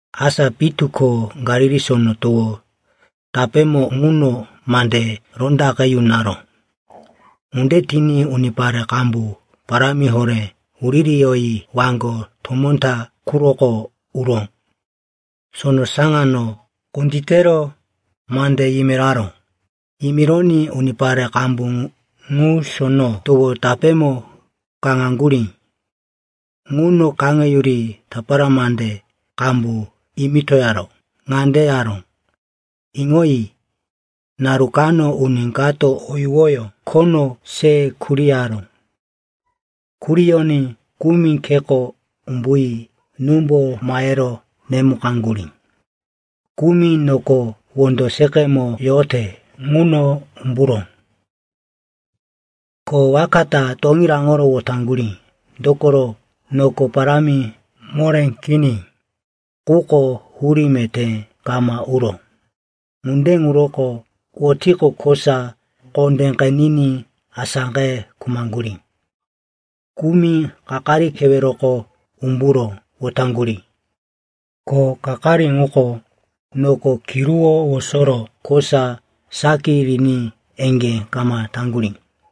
Asa pitu ko Galili Sono Towo tapémo ŋuno mande rondaqe yunaró. Ŋunde tiní unipare qambu parámi horé wuririyoyi waŋgo tomó ta quroko uro sono saŋano kunditero mande yimiraró. Yimironí unipare qambu ŋu sono towo tapémo kaŋaŋgurí. Ŋuno kaŋeyuri tapara mande qambu yimitoyoro ŋande yaró, “Iŋoyi, naru kano uni kato o yuwoyó khono se kuriyaró. Kuriyoní kumi kheko umbuyi númbo mahero nemukaŋgurí. Kumi noko wondo seqemo yote ŋuno umburó, ko waka ta toŋí raŋoro wotaŋgurí, dokoro noko parámi moré kini. Quko hurí meté kama uró. Ŋunde ŋuroko wotiqo, kosa kondé qeniní asáqe khumaŋgurí. Kumi kakari keweroko umburo wotaŋgurí, ko kakari muko noko kiruwó wosoro kosa saki riní eŋgé kama taŋgurí.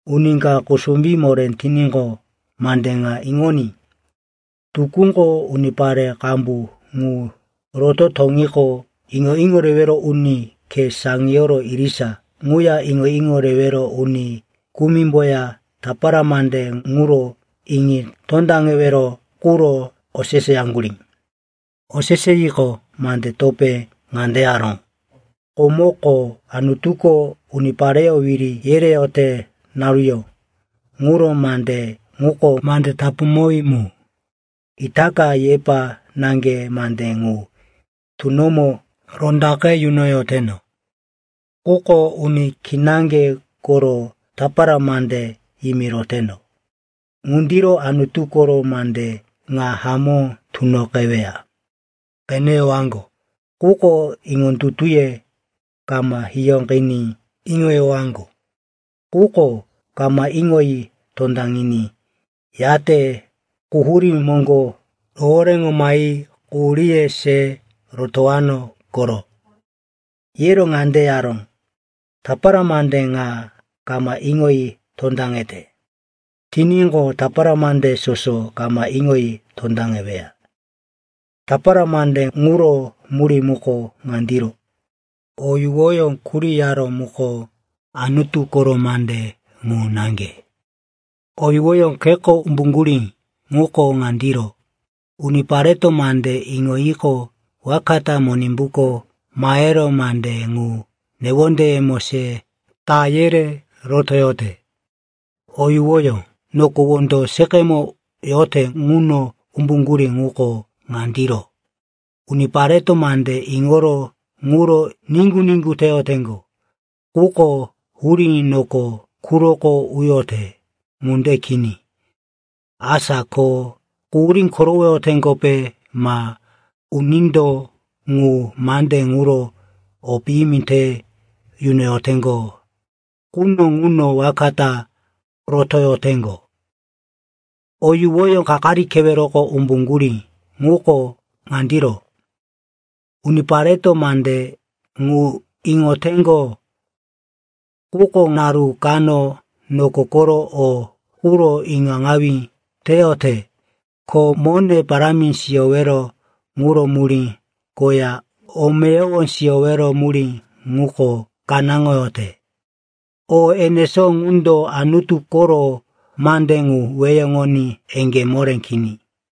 “Uni ka kusumbí moré tiníqo, mande ŋa iŋoní.” Tukúko, unipare qambu ŋu roto toŋiqo, iŋo-iŋo rewero uni khe saŋiyoro irisa ŋuya iŋo-iŋo rewero uni kumimboya tapara mande ŋuro iŋi tondaŋewero quro oseseyaŋgurí. Oseseyiqo, mande topé ŋande yaró, “Komoko, Anutuko unipareyó wiri yereyote naruyó ŋuro mande ŋuko mande tapuŋowí mu. Itaka yepa naŋge mande ŋu tunomo rondaqe yunoyoteno, quko uni kinaŋge koro tapara mande yimiroteno. Ŋundiro Anutu koro mande ŋa hamó tunoqeweya: “‘Qeneyowaŋgo, quko iŋondutuye kama hiyóqiní, Iŋoyowaŋgo, quko kama iŋoyi tondaŋiní, Yate quhurí moŋgo rohoréŋo mahi quhuríye se rotowano koro.’” Yero ŋande yaró, “Tapara mande ŋa kama iŋoyi tondaŋete tiníqo, tapara mande soso kama iŋoyi tondaŋeweya. Tapara mande ŋuro murí muko ŋandiro: o yuwoyó kuriyaró muko Anutu koro mande ŋu naŋge. O yuwoyó kheko umbuŋgurí ŋuko ŋandiro: unipareto mande iŋoyiqo, waka ta Monimbuko mahero mande ŋu newondeyemo se ta yere rotoyote. O yuwoyó noko wondo seqemo yote ŋuno umbuŋgurí ŋuko ŋandiro: unipareto mande iŋoro ŋuro niŋgu-niŋgu teyoteŋgo. Quko hurí noko quroko uyote ŋunde kini. Asa ko quhurí korowoyoteŋgope ma unindo ŋu mande ŋuro o piyimi te yunoyoteŋgo quno ŋuno waka ta rotoyoteŋgo. O yuwoyó kakari keweroko umbuŋgurí ŋuko ŋandiro: unipareto mande ŋu iŋoteŋgo. Quko naru kano noko koro o quro iŋaŋawí teyote, ko mone parámi siyowero ŋuro murí koya o meyowo siyowero murí ŋuko kanáŋoyote. O enesó ŋundo Anutu koro mande ŋu weheŋoní eŋgé moré kini.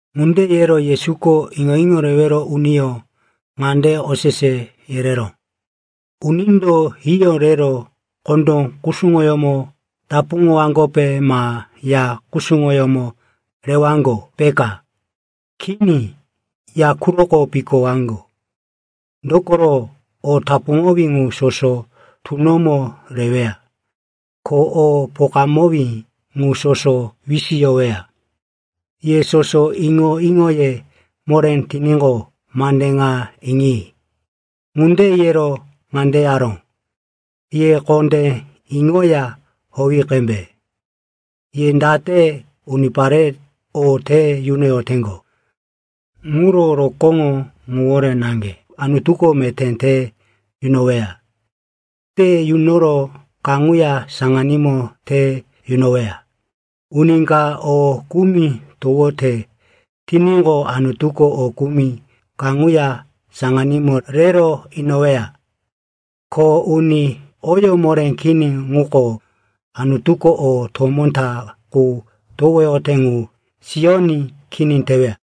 Ŋunde yero Yesuko iŋo-iŋo rewero uniyó ŋande osese yereró, “Unindo hiyó rero kondó kusuŋoyómo tapuŋowaŋgope ma ya kusuŋoyómo rewaŋgo, peka? Kini, ya quroko pikowaŋgo. Dokoro o tapuŋowí ŋu soso tunomo reweya. Ko o pokamowí ŋu soso wisiyoweya. Ye soso iŋo-iŋoye moré tiníqo, mande ŋa iŋi.” Ŋunde yero ŋande yaró, “Ye kondé iŋoya howi qembe. Ye date unipare o te yunoyoteŋgo ŋuro rokóŋo ŋuwore naŋge Anutuko meté te yunoweya. Te yunoro kaŋuya saŋanímo te yunoweya. Uni ka o kumi towote tiníqo, Anutuko o kumi kaŋuya saŋanímo rero inoweya. Ko uni oyó moré kini ŋuko, Anutuko o tomó ta qu towoyote ŋu siyoní kini teweya.”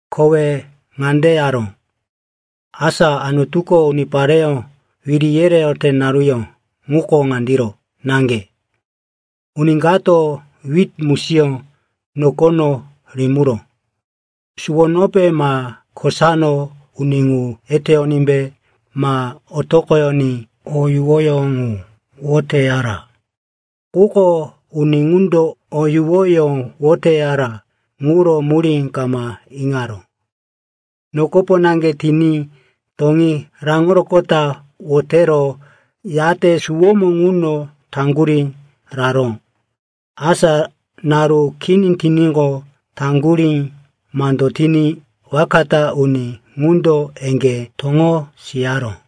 Kowe ŋande yaró, “Asa, Anutuko unipareyó wiri yereyote naruyó ŋuko ŋandiro naŋge. Uni kato wit musiyó nokono rimiró. Suwonope ma kosano uni ŋu eteyonímbe ma otoqoyoní, o yuwoyó ŋu woteyara. Quko uni ŋundo o yuwoyó woteyara ŋuro murí kama iŋaró. Nokopo naŋge tiní toŋí raŋoroqota wotero, yate suwómo ŋuno taŋgurí raró. Asa naru kini tiníqo, taŋgurí mando tiní waka ta uni ŋundo eŋgé toŋo siyaró.”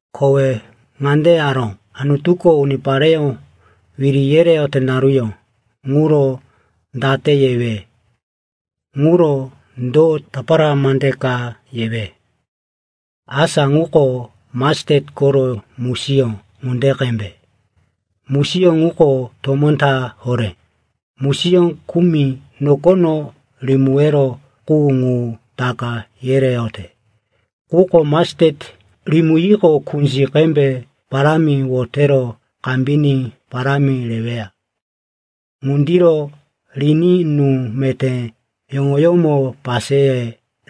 Kowe ŋande yaró, “Anutuko unipareyó wiri yereyote naruyó ŋuro date yewe? Ŋuro do tapara mande ka yewe? Asa ŋuko mastet koro musiyó ŋunde qembe. Musiyó ŋuko tomó ta horé, musiyó kumi nokono rimiwero qu ŋu taka yereyote. Quko mastet rimiyiqo, kunzi qembe parámi wotero kambiní parámi reweya. Ŋundiro riní nú meté yoŋoyómo paseye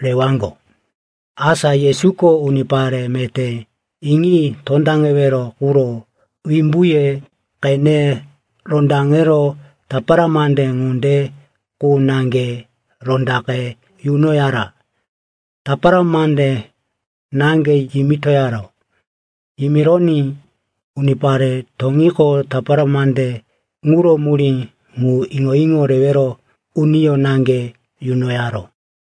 rewaŋgo.” Asa Yesuko unipare meté iŋi tondaŋewero quro wimbuye qene rondaŋero tapara mande ŋunde qu naŋge rondaqe yunoyara. Tapara mande naŋge yimitoyaró. Yimironí unipare toŋiqo, tapara mande ŋuro murí ŋu iŋo-iŋo rewero uniyó naŋge yunoyaró.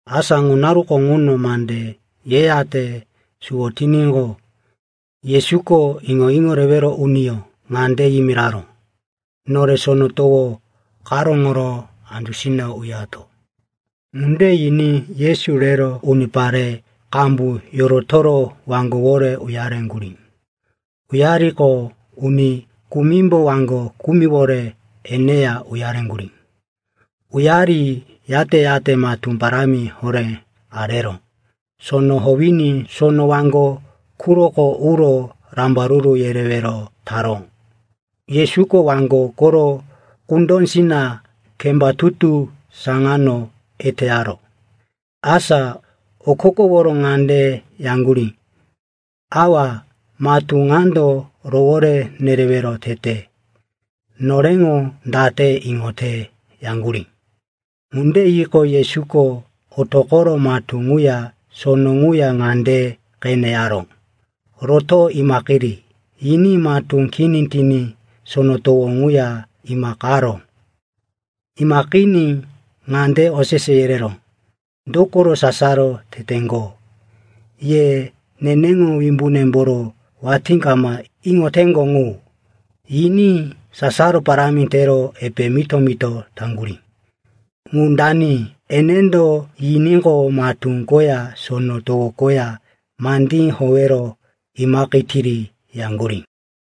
Asa ŋu naruko ŋuno mande yeyate suwo tiníqo, Yesuko iŋo-iŋo rewero uniyó ŋande yimiraró, “Nore sono towo karóŋoro andusina uyato.” Ŋunde yiní Yesu rero unipare qambu yorotoro waŋgowore uyareŋgurí. Uyariqo, uni kumimbo waŋgo kumiwore eneya uyareŋgurí. Uyari yate-yate matú parámi horé arero sono howiní sono waŋgo quroko uro rambaruru yerewero taró. Yesuko waŋgo koro kundósina kemba tutu saŋano eteyaró. Asa okokoworo ŋande yaŋgurí, “Awa, matú ŋando rowore nerewero tete. Noreŋo date iŋote?” yaŋgurí. Ŋunde yiqo, Yesuko otoqoro matú ŋuya sono ŋuya ŋande qene yaró, “Roto, imaqiri!” yiní matú kini tiní sono towo ŋuya imaqaró. Imaqiní ŋande osese yereró, “Dokoro sasaro teteŋgo? Ye neneŋo wimbunemboro watí kama iŋoteŋgo ŋu!” Yiní sasaro parámi tero epe mito-mito taŋgurí, “Ŋu dani? Enendo yiníqo, matú koya sono towo koya mandí howero imaqetiri!” yaŋgurí.